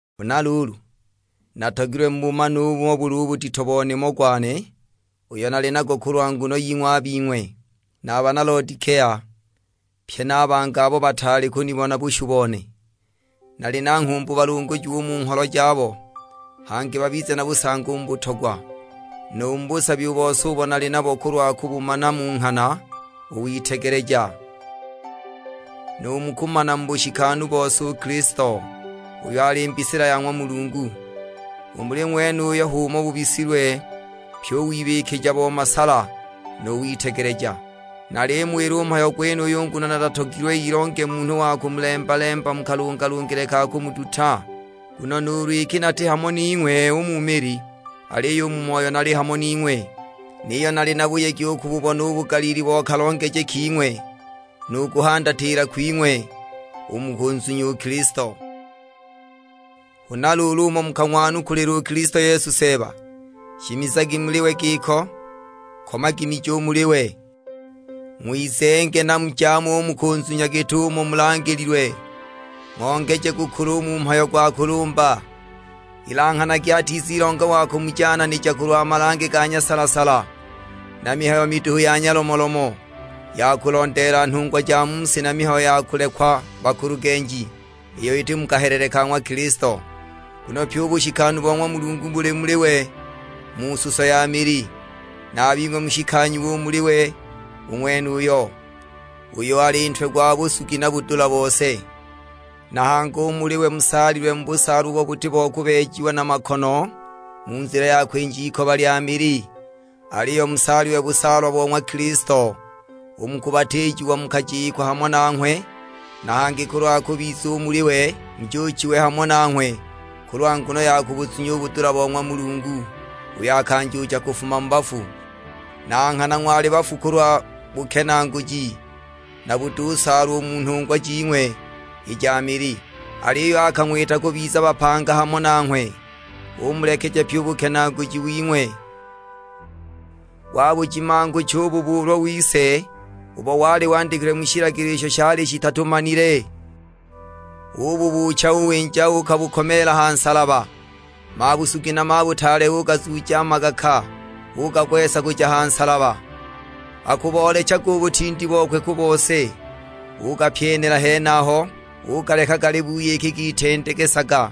Huna luulu, natogilwe mubumane umo buli u budito bo nimo gwane uyo nali nago kulwa nguno ying'we a bing'we, na a bana Lodikea, pye na a bangi abo bataali kunibona bushu bone. Nali na nghumbu balungujiwe u mu ngholo jabo, hangi babize na busangi u mu butogwa, nu mu busabi u bose ubo bali nabo kulwa kubumana mu nghana u witegeleja, nu mu kumana mu bushikanu bose u Kilisto, uyo ali mbisila ya ng'wa Mulungu. U muli ng'wenuyo h'umo bubisilwe pyi u wibikija bo masala nu witegeleja. Nalimuwila u mhayo gwenuyu nguno natatogilwe ilonge munhu wa kumulemba-lemba mu kalungalungile ka kumuduta. Nguno nuulu iki nati hamo ning'we u mu mili, aliyo u mu moyo nali hamo ning'we; niyo nali na buyegi u kububona u bugaliili bo kalongeje king'we, nu kuhandatila kwing'we u mu kunzunya u Kilisto. Huna luulu umo mukang'wanukulila u Kilisto Yesu Seeba, shimizagi muli we giko. Komagi miji u muli we, ng'wizenge na mujaame u mu kuzunya git'umo mulangililwe; ng'ongeje kukula u mu mhayo gwa kulumba. Ilanghanagi atizilonga wa kumujananija kulwa malange ga nyasala-sala, na mihayo miduhu ya nyalomolomo, ya kulondeela nhungwa ja mu si na mihayo ya kulekwa bakulugenji, iyo iti mu kahelele ka ng'wa Kilisto. Nguno pyi u bushikanu bo ng'wa Mulungu buli muli we mu suso ya mili. Na a bing'we mushikanyiwe u muli we u ng'wenuyo, uyo ali Ntwe gwa busugi na budula bose. Na hangi u muli we musaalilwe mu busaalwa ubo buti bo kubeejiwa na makono mu nzila ya kwinja ikoba lya mili; aliyo musaalilwe busaalwa bo ng'wa Kilisto. U mu kubatiijiwa mukajikwa hamo nanghwe, na hangi kulwa kubiza u muli we, mujuuchiwe hamo nanghwe kulwa nguno ya kubuzunya u budula bo ng'wa Mulungu uyo akanjuucha kufuma mu bafu. Na nghana ng'wali bafu kulwa bukenaaguji, na butusaalwa u mu nhungwa jing'we i ja mili; aliyo akang'wita kubiza bapanga hamo nanghwe, umulekeja pyi u bukenaaguji wing'we. Wabujimangucha u bubuulwa wise ubo wali wandikilwe mu shilagilo isho shali shituchaamile; ububuucha uwinja uukabukomeela ha nsalaba. Mabusugi na mabutaale ugazuuja magaka, ugagwesa kuja ha nsalaba, akuboolechaga u butindi bokwe ku bose, ugapyenela henaho, ugaleka gali buyiki gitendegesaga!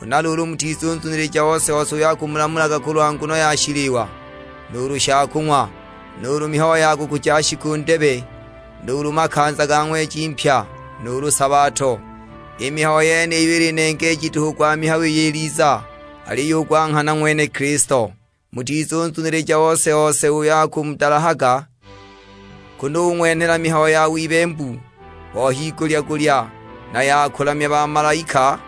Huna luulu mutizunzunilija ose-ose uyo akumulamulaga kulwa nguno ya shiliwa nuulu shakung'wa, nuulu mihayo ya kukuja shiku ndebe, nuulu makanza ga ng'weji mpya, nuulu sabato. I mihayo yeniyo ili nengeeji duhu gwa mihayo iyo iliza; aliyo u gwa nghana ng'wene Kilisto. Mutizunzunilija ose-ose uyo akumudalahaga, kunu ung'wenhela mihayo ya wibembu bo higulya-gulya, na ya kubalamya bamalaika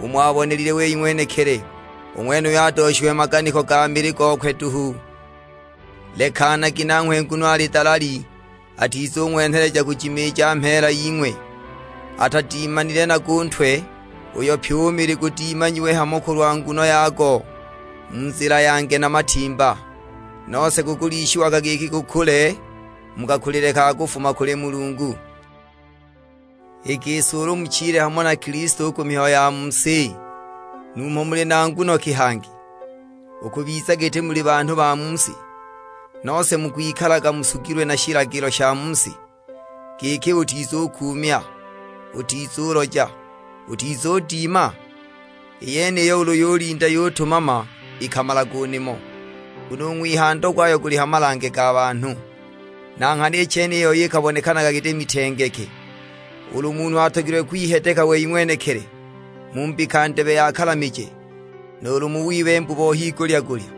umo abonelile wei ng'wenekili. U ng'wenuyo adooshiwe maganiko ga mili gokwe duhu, lekanagi nanghwe nguno ali dalali; atizung'wenheleja kujimiija mheela ying'we. Atadimanile nago u Ntwe, uyo pyi u mili gudimanyiwe hamo kulwa nguno yago, mu nzila ya nge na matimba; nose gukulishiagwa giki gukule mu kakulile ka kufuma kuli Mulungu. I gisi ulu muchile hamo na Kilisto u ku mihayo ya mu si, numho muli na nguno ki hangi u kubiza giti muli banhu ba mu si, nose mukwikalaga musugilwe na shilagilo sha mu si; giki, "Utizukuumya, utizuloja, utizudima?" I yeniyo ulu yulinda yutumama ikamalaga u nimo, nguno u ng'wihando gwayo guli ha malange ga banhu. Na nghana i chene i yoi ikabonekanaga giti mitengeke, ulu munhu atogilwe kwihedeka wei ng'wenekili mu mbika ndebe ya kalamije, nuulu mu wibembu bo higulya-gulya,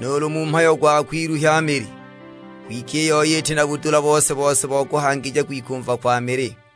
nuulu mu mhayo gwa kwiluhya mili; kwike i yoi iti na budula bose-bose bo kuhangija kwikumva kwa mili.